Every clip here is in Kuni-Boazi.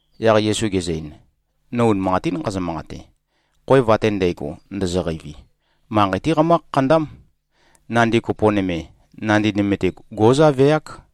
Yaq Yesu gezø-ein, “No unimanqatín nqazø-manqate. Khoev ate ndægo, ndozoqeivi, manqei-té qamǿ-khakhandám. Nandi kopo nøme, nandi nøme-te, gó꞉zaveák.”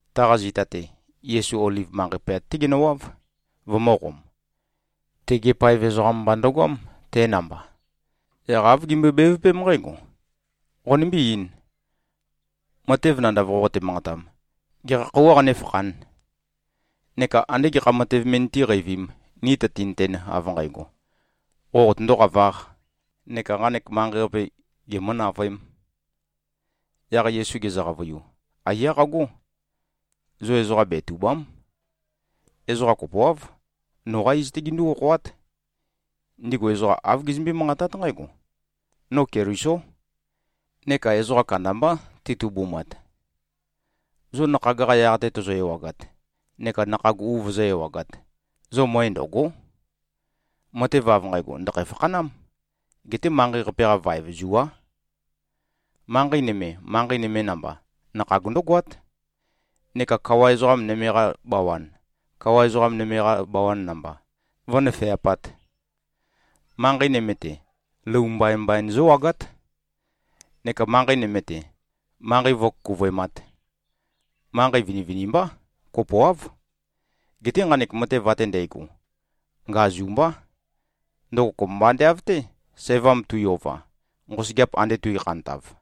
Taqa zita-te, Yesu Oliv manqei poyat-té genøwáv, vømø̄qom. Tegi paev ezoqam mba ndøgoám, te namba. Yaq āv gimbøe-bevøpém nqǽgo, “Qonimbí-eīn. Matev nandav qoqote-manqatam, gekha khøuwā qanéfakhān? Neka andé gekha matev me nitíqeivīm, ni tøtinøten, av nqægo, qo qotøndō-qavāq neka nqanek manqei-qape gemø̄-navøēm?” Yaq Yesu gezø-qavøiu, “Aiyá qagó. Zo ezoqa betùba᷄m. Ezoqa kopoáv, noqá iz-té gindú-okhoát. Ndigu ezoqa āv gizømbé-manqatát nqǽgo, ‘No Kelisó’, neka ezoqa kandambá titubumat. Zo nakhag-qa yaq-te tozo-ewagat neka nakhag u vozó-ewagāt, zo møe ndø̀go᷄. Matev av nqægo, ndø̀khæ-fakhanám. Geté manqei-qape-qa vaev zuá. Manqei nøme, manqei nøme namba, nakhag ndǿgoát, neka kawa ezoqa nøme-qa bawan, kawa ezoqa nøme-qa bawan namba, vǿnøfeapāt. Manqei nøme-te, lou mbaimbai zǿwagát, neka manqei nøme-te, manqei vǿkukuvøemāt. Manqei vinivinimbá. Kopoáv. Geté nqanek matev ate ndægo, ngazu mbá. Ndøgo kopømba ande av-té, sævam tui-ova, nqosøgeap ande tuikhantav.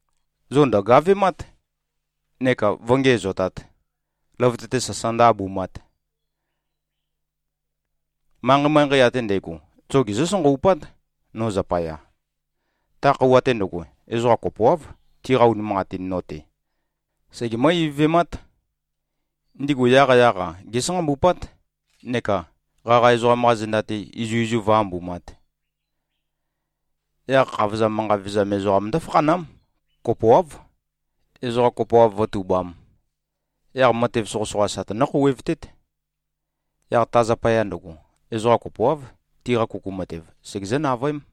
Zo ndø̀gavemát neka vǿngiæzotāt, løvøte-te sasa ndǿ-abumāt. Manqei-manqei ate ndægo, zo gezǿ-sanqawupát, no zapaya. Ta khøuwa-te ndøgo ezoqa kopoáv, tiqa unimanqatin no-te segemǿ-ivøvemát. Ndigu yaqyaq-a gésanqambupát neka qaqa ezoqam-qa zenda-te izuizu vǿ-ambumāt. Yaq khavozam manqa vevezam ezoqam ndǿfakhanám, kopoáv, ezoqa kopoav vǿtubām. Yaq matev soqøsoqa sa tønǿ-khouwevtét. Yaq ta zapaya ndøgo, ezoqa kopoáv, tiqa kuku matev segezǿ-navøém.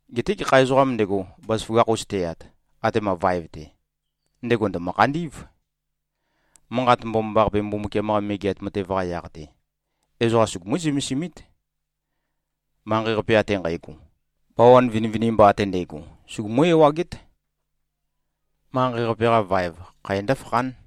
Geté gekha ezoqām ndego, bazaføgakh-us teyat, atema vaev-te, ndego ndø̀mø-khandí꞉v. Manqat Mbomambaqape, Mbumbukiam-qa Megeat Matev-qa yaq-te, ezoqa sugumú-zømesimít, manqei-qape ate nqægo. Bawan vinivinimba ate ndægo, sugumú-ewagét. Manqei-qape-qa vaev, khæ ndǿfakhán.”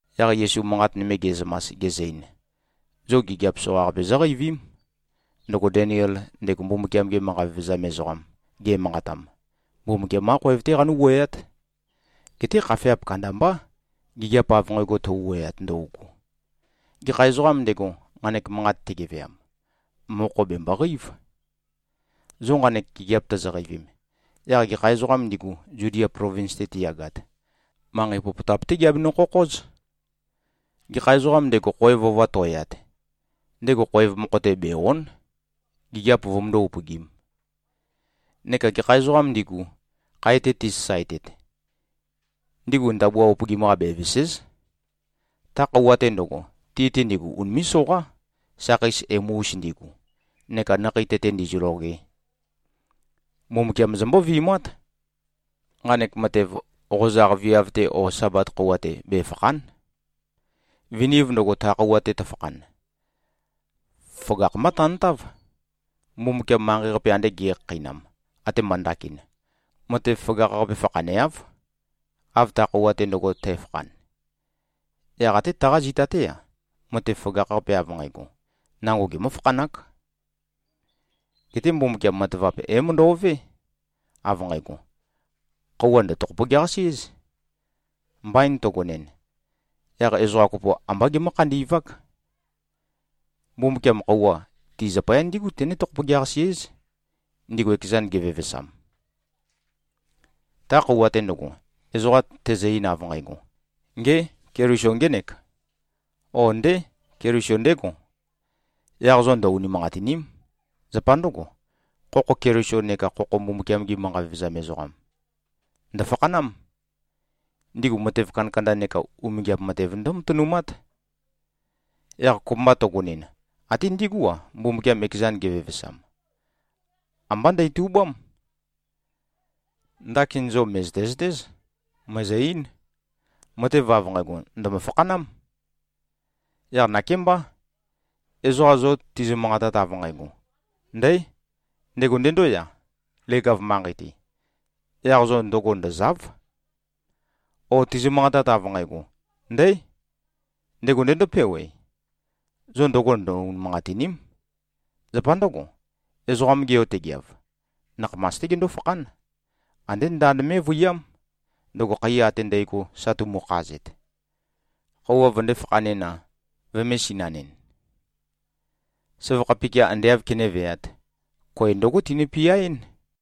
Yaq Yesu manqat nøme ge꞉zømas, gezø-ein, “Zo gigiap soqaqape zóqeivím, ndøgo Deniel, ndego Mbumbukiam-ge manqa vevezam ezoqam, ge꞉manqatam. Mbumbukiam-qá khoev-té qanú-wuøyát. Geté khafeap kandambá, gigiap av nqægo tøu-wuøyat ndøugu. (Gekha ezoqām ndego, nqanek manqat tegeveam, mokho bèmboqeív.) Zo nqanek gigiap tozoqeivim, yaq gekha ezoqām ndigu, Zudia plovins-te tiyagat, manqei popotap-té giabenø-khokhóz. Gekha ezoqām ndego, khoev ova to꞉yat, ndego khoev mokho-te bè-o᷄n, gigiap vømøndó-upøgīm. Neka gekha ezoqām ndigu, khae-te tisasaetet, ndigu ndabua upøgim-qa bevèse᷄z. Ta khøuwa-te ndøgo, ti-te ndigu unimé꞉-soqá, sakheis emu-us ndigu neka nakhei tete ndizøloge. Mbumbukiam zombó-vi꞉mát. Nqanek matev, qozaq viav-te o Sabat khøuwa-te, befàkha᷄n. Viniv ndøgo, ta khøuwa-te tøfakhan, føgakh-mbá tantáv. Mbumbukiam manqei-qape ande ge꞉khakheinam, atema ndakin, matev føgakh-qape fakhaneáv, av ta khøuwa-te ndøgo tæfakhan. Yaq até taqa zita-té-a, matev føgakh-qape av nqægo, nango gemǿ-fakhanák. Geté Mbumbukiam matavap é-møndo꞉vé, av nqægo, khøuwa ndø̀-tokhopogeaqasí꞉z. Mbain tøgonɨn, yaq ezoqa kopo ambá gemǿ-khandi꞉vák. Mbumbukiam, khøuwa, ti zapaya ndígu tené-tokhopogeaqasí꞉z, ndigu ekezan gevevesam. Ta khøuwa-te ndøgo, ezoqa tezø-ein, av nqægo, ‘Ngé! Keliso ngének,’ ó, ‘Ndé. Keliso ndégo,’ yaq zo ndø-unimanqatìni᷄m. Zapa ndǿgo, khokho Keliso neka khokho Mbumbukiam-gi manqa vevezam ezoqam ndø̀fakhanám. Ndigu matev kandakanda neka umingiap matev ndǿmatønumát. Yaq kopømba tøgønɨn, até ndigú-a, Mbumbukiam ekezan gevevesam, ambá ndætubám. Ndakin zo mø̀zøte-zøtéz. Mø̀ezø-eín, matev av nqægo, ndø̀mø-fakhanám. Yaq nakémbá, ezoqa zo tizø-manqatat, av nqægo, ‘Ndǽ! Ndego ndendóya, leg-av manqei-te,’ yaq zo ndøgo ndø̀za᷄v. O tizø-manqatat, av nqægo, ‘Ndǽ! Ndego ndendópewe,’ zo ndøgo ndø-unimanqatìni᷄m. Zapa ndǿgo, Ezoqam-ge Yo tegeav, nakhamas-té gendó-fakhán. Andé ndand mé꞉vøiyám, ndøgo khaiya ate ndægo sa tumukhazet, khøuwa vøndē-fakhanɨn-a, vømē-sinanɨn. Søvakha pikia ande āv kenéveāt, koe ndǿgo tinø-piaɨ́n.”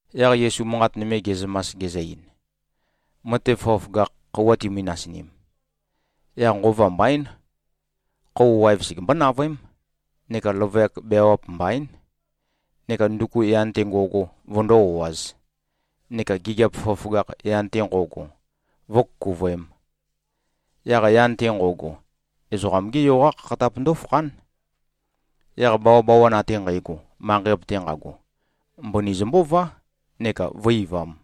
Yaq Yesu manqat nøme ge꞉zømas, gezø-ein, “Matev føgøføgakh khøuwa timi-nasinim, yaq nqova mbaín, khøuwa waev segembó-navøém, neka løvøyak beawap mbaín, neka nduku yan-te ngo꞉go vøndó-o꞉āz, neka gigiap føgøføgakh, yan-te nqo꞉go, vǿkukuvøēm. Yaq yan-te nqo꞉go, Ezoqam-gé Yo-qá khakhatap ndó꞉fakhán. Yaq bawabawan ate nqægo, manqei-qape-te nqago, mbøni zømbǿvá neka vǿ-eivām.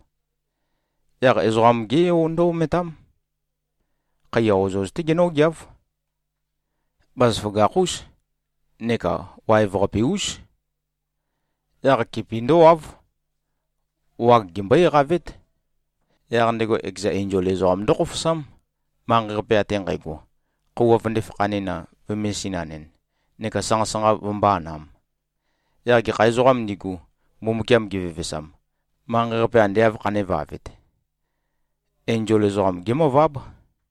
Yaq Ezoqam-gé Yo ndǿ-ometám. Khaiya ozoz-té genǿgeáv. Bazaføgakh-ús neka waev-qape-ús. Yaq kipi ndǿwáv. Wag gembøé-eqavét. Yaq ndego ekeza enzol ezoqam ndókhofosám, manqei-qape ate nqægo, khøuwa vøndē-fakhanɨn-a, vømē-sinanɨn, neka sanqa-sanqa vømbō-anam. Yaq gekha ezoqām ndigu, Mbumbukiam gevevesam, manqei-qape ande āv khandēvavet, enzol ezoqam gémøváb.”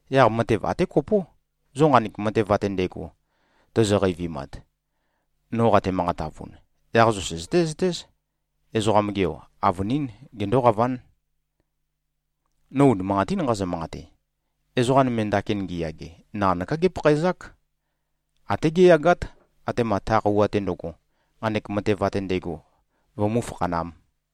Yaq matev até kopó. Zo nqanek matev ate ndægo tozo-qeivimat, no qate-manqatavun, yaq zo søzøté-zøtéz, Ezoqam-ge Yo, avønín gendóqaván. No unimanqatín nqazø-manqate. Ezoqa nøme, ndakin ngiyage naqanøká gépakhaezák. Até géyagát, atema ta khøuwa-te ndøgo, nqanek matev ate ndægo vømú-fakhanām.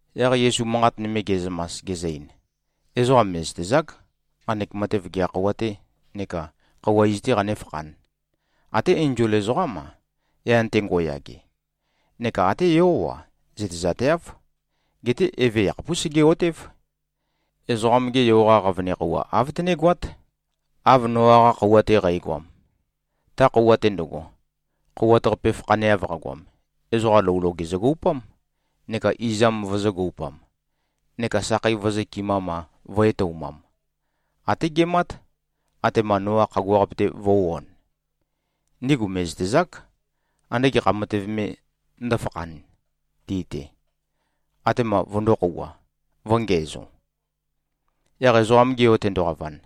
Yaq Yesu manqat nøme ge꞉zømas, gezø-ein, “Ezoqa mè꞉zøtezák, nqanek matev gekha khøuwa-tē neka khøuwa iz-tē qanéfakhān. Até enzol ezoqám-a, yan-te ngo꞉yage, neka até Yó-a, zøtezateáv. Geté Eve yakhapús sege꞉-otév. Ezoqam-ge Yo-qa qavøne khøuwa āv tønégoát, av Noa-qa khøuwa-te qægoam. Ta khøuwa-te ndøgo, khouwat-qape fakhaneav qagoam, ezoqa lou loge zøgoupám, neka izam vøzø̄-goupam, neka sakhei vø̄zøkɨmam-a, vø̄-etoumam, até gemát, atema Noa khagua-qape-te vø̄u-on. Ndigu mè꞉zøtezák, ande gekha matev me ndǿfakhān ti-te, atema vøndō-khouwa, vø̄ngiæzo. Yaq Ezoqam-ge Yo tendoqavan,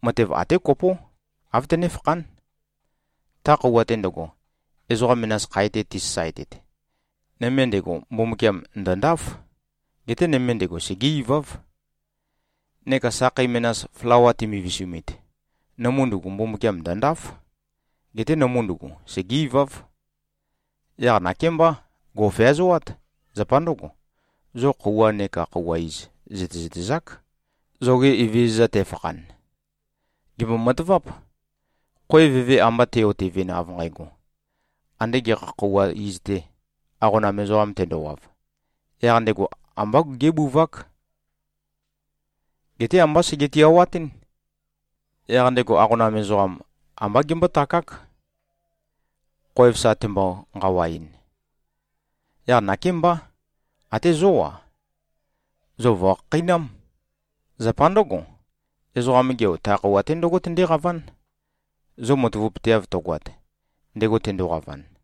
matev até kopó, āv tønéfakhán. Ta khøuwa-te ndøgo, ezoqa menas khae-te tisasaetet, nøme ndego, Mbumbukiam ndø̀ndáf. Geté nøme ndego, segé-iváv. Neka sakhei menas, flawa timivisumit, nømu ndugu, Mbumbukiam ndø̀ndáf. Geté nømu ndugu, segé-iváv. Yaq nakémbá. Gò꞉feazoát. Zapa ndǿgo, zo khøuwa neka khøuwa iz zø̀tezøtezák, zoge Evezøza te꞉fakhan. Gèmbo-mataváp: Khoev eve amba te꞉-otevɨn, av nqægo, ande gekha khøuwa iz-te, aqonam ezoqam tendowav, yaq ndego ambá gé꞉buvák. Geté ambá sege-tiawatɨ́n. Yaq ndego aqonam ezoqam ambá gembótakák, khoev sa tembo-nqawaɨn. Yaq nakémbá. Até zó-a, zo vò꞉khakheinám. Zapa ndǿgo, Ezoqam-ge Yo, ta khøuwa-te ndǿgo tendéqaván, zo matavapøteav tøgoat, ndego tendoqavan.”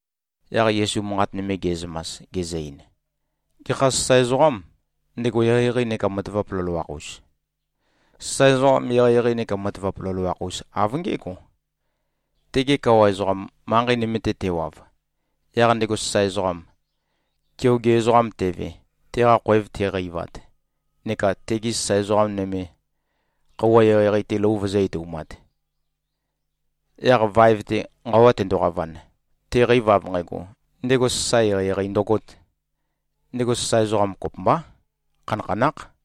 Yaq Yesu manqat nøme ge꞉zømas, gezø-ein, “Gekha sasae ezoqâm, ndego eqeieqei neka matavap loloakh-us? Sasae ezoqam eqeieqei neka matavap loloakh-us av ngé꞉go. Tege kawa ezoqam, manqei nøme-te tewav, yaq ndego sasae ezoqam, keoge ezoqam teve, teqa khoev teqeivat neka tegi sasae ezoqa nøme, khøuwa eqeieqei-te lou vøzǿ-etoumāt, yaq vaev-te nqawa tendoqavan, teqeiv av nqægo, ndego sasae eqeieqei ndøgōt, ndego sasae ezoqam kopømbá, khanakhanákh.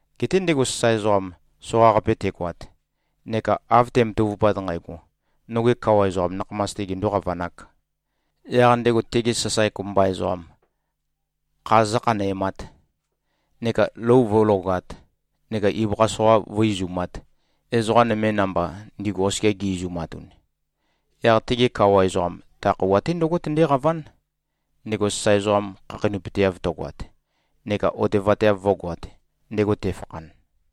Geté ndego sasae ezoqam, soqaqape tegoat neka av te꞉matavupat nqægo, noge kawa ezoqam nakhamas-te gendō-qavanāk, yaq ndego tegi sasae kopømba ezoqam kha zǿkhanæmāt, neka lou vǿlogāt neka ibøkha soqa vǿ-izumāt, ezoqa nøme namba, ndigu oskia gi-izumatun, yaq tege kawa ezoqam ta khøuwa-te ndǿgo tendéqaván, ndego sasae ezoqam khakheinøpøteav tøgoat neka otevateav vǿgoāt, ndego tefakhan.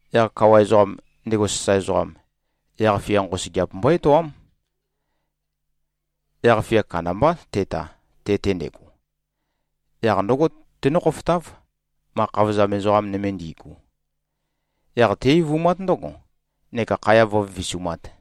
Yaq kawa ezoqam, ndego sasae ezoqam, yaq-fia nqosøgeap mbó-etoám. Yaq-fia kandambá teta, te-te ndego. Yaq ndǿgo tenǿ-khofotáv, ma khavozam ezoqa nøme ndi꞉gu. Yaq té-eivumát ndǿgo, neka khaya vǿvivisumāt.”